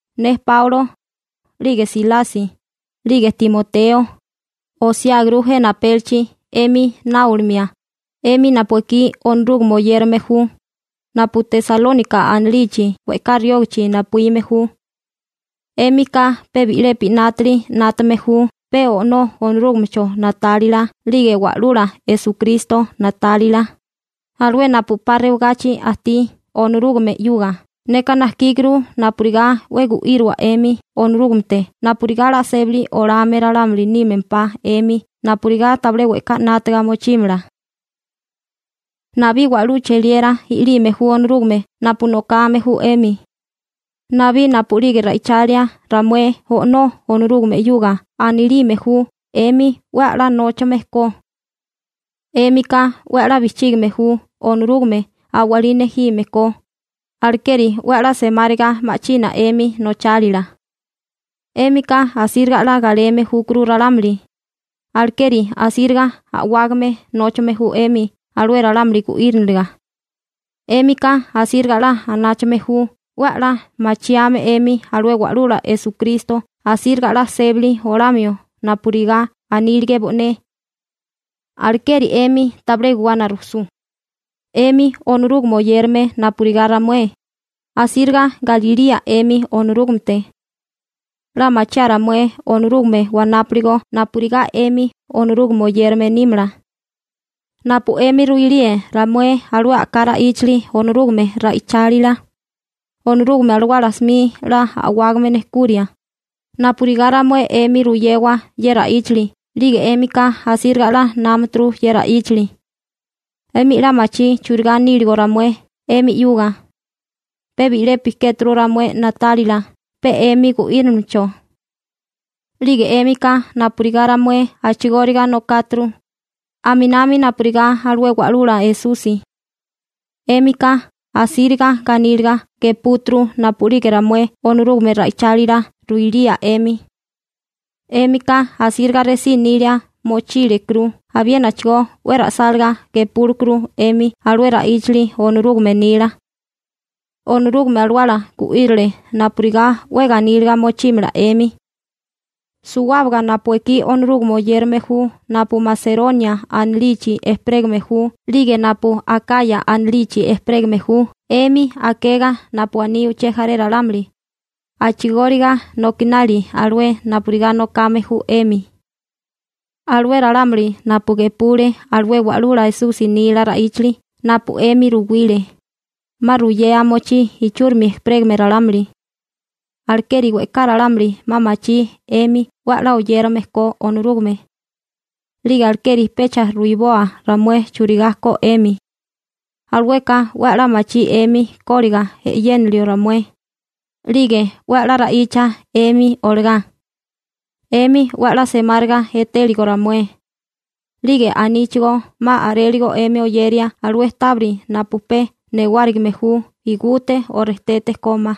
Ne Páulo, 'lige Silasi, 'lige Timoteo, osiáguru jena apélichi 'emi náolimia, 'emi napu ekí Onorúgame oyérame ju, napu Tesalónika anilichi we'ká riógachi napuíme ju. 'Émika pe bi'lepi 'nátili 'nátame ju pe O'nó Onorúgamecho na'tálila 'lige Wa'lula Esukristo na'tálila, alué napu 'pa rewagachi ajtí Onorúgame 'yuga. Neka najkíguru napurigá 'we gu'íriwa 'emi Onorúgamete napurigá 'la sébali olame ralámuli nímempá 'emi napurigá tabilé we'ká 'nátaga mochímala. Nabí wa'lú cheliera i'lime ju Onorúgame napu nokame ju 'emi. Nabí napu'lige ra'ichalia ramué O'nó Onorúgame 'yuga anilime ju 'emi 'we a'lá nóchame ko. 'Émika 'we a'lá bijchígame ju Onorúgame a'walí nejime ko, alekeri 'we a'lá semáriga ma'china 'emi nochálila. 'Émika asíriga 'la galeme júkuru ralámuli, alekeri asíriga a'wágame nóchame ju 'emi alué ralámuli gu'íriniliga. 'Émika asíriga 'la anáchame ju 'we a'lá machiame 'emi alué Wa'lula Esukristo asíriga 'la sébali olamio napurigá anílige bo'né. Alekeri 'emi tabilé guwana rujsú. 'Emi Onorúgame oyérame napurigá ramué, asíriga galilía 'emi Onorúgamete. 'La machiáa ramué Onorúgame wanápiligo napurigá 'emi Onorúgame oyérame nímala. Napu 'emi ruilíe ramué alué a'ká ra'íchali Onorúgame ra'ichálila, Onorúgame Alawala 'smi 'la a'wágame nejkuria, napurigá ramué 'emi ruyewa ye ra'íchali, 'lige 'émika asíriga 'la inámaturu ye ra'íchali. 'Emi 'la machí churigá níligo ramué 'emi 'yuga. Pe bi'lepi kéturu ramué na'tálila pe 'emi gu'írilimecho. 'Lige 'émika napurigá ramué a'chigóriga nokáturu, aminami napurigá alué Wa'lula Esusi. 'Émika asíriga ganíliga gepúturu napu'lige ramué Onorúgame ra'ichálila ruilía 'emi. 'Émika asíriga resí nilia mochílekuru abiénachigó 'we ra'sálagá gepúlekuru 'emi alué ra'íchali Onorúgame nila. Onorúgame Alawala gu'írile napurigá 'we ganíliga mochímala 'emi. Suwábaga napu ekí Onorúgame oyérame ju napu Maseronia anilichi ejperégame ju 'lige napu Akaya anilichi ejperégame ju 'emi akega napu aní uché jaré ralámuli, a'chigóriga nokinali alué napurigá nokame ju 'emi. Alué ralámuli napu gepule alué Wa'lula Esusi nila ra'íchali napu 'emi ruwile, 'ma ruyea mochí ichúrimi ejperégame ralámuli. Alekeri we'ká ralámuli 'ma machí 'emi 'we a'lá oyérame ko Onorúgame. 'Lige alekeri pecha ruwiboa ramué churigá ko 'emi. Alueka 'we a'lá machí 'emi kóliga e'yénilio ramué, 'lige 'we a'lá ra'icha 'emi olagá, 'emi 'we a'lá semáriga etéligo ramué. 'Lige aníchigó 'ma a'réligo 'emi oyeria alué tábiri napu pe newárigime ju igute o rejtete kómá,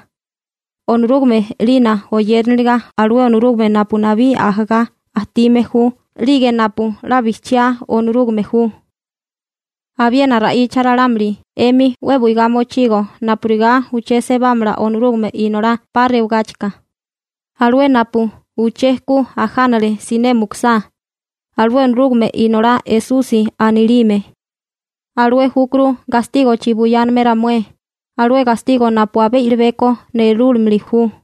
Onorúgame 'lina oyériniliga alué Onorúgame napu nabí ajagá ajtime ju 'lige napu 'la bijchiá Onorúgame ju. Abiena ra'icha ralámuli 'emi 'we buigá mochigo napurigá uché sebámala Onorúgame Inolá 'pa rewagáchika, alué napu uché ku ajánale siné mukusá, alué Onorúgame Inolá Esusi anilime. Alué júkuru gastígochi buyáname ramué, alué gastigo napu abé i'libeko nerúlimili ju.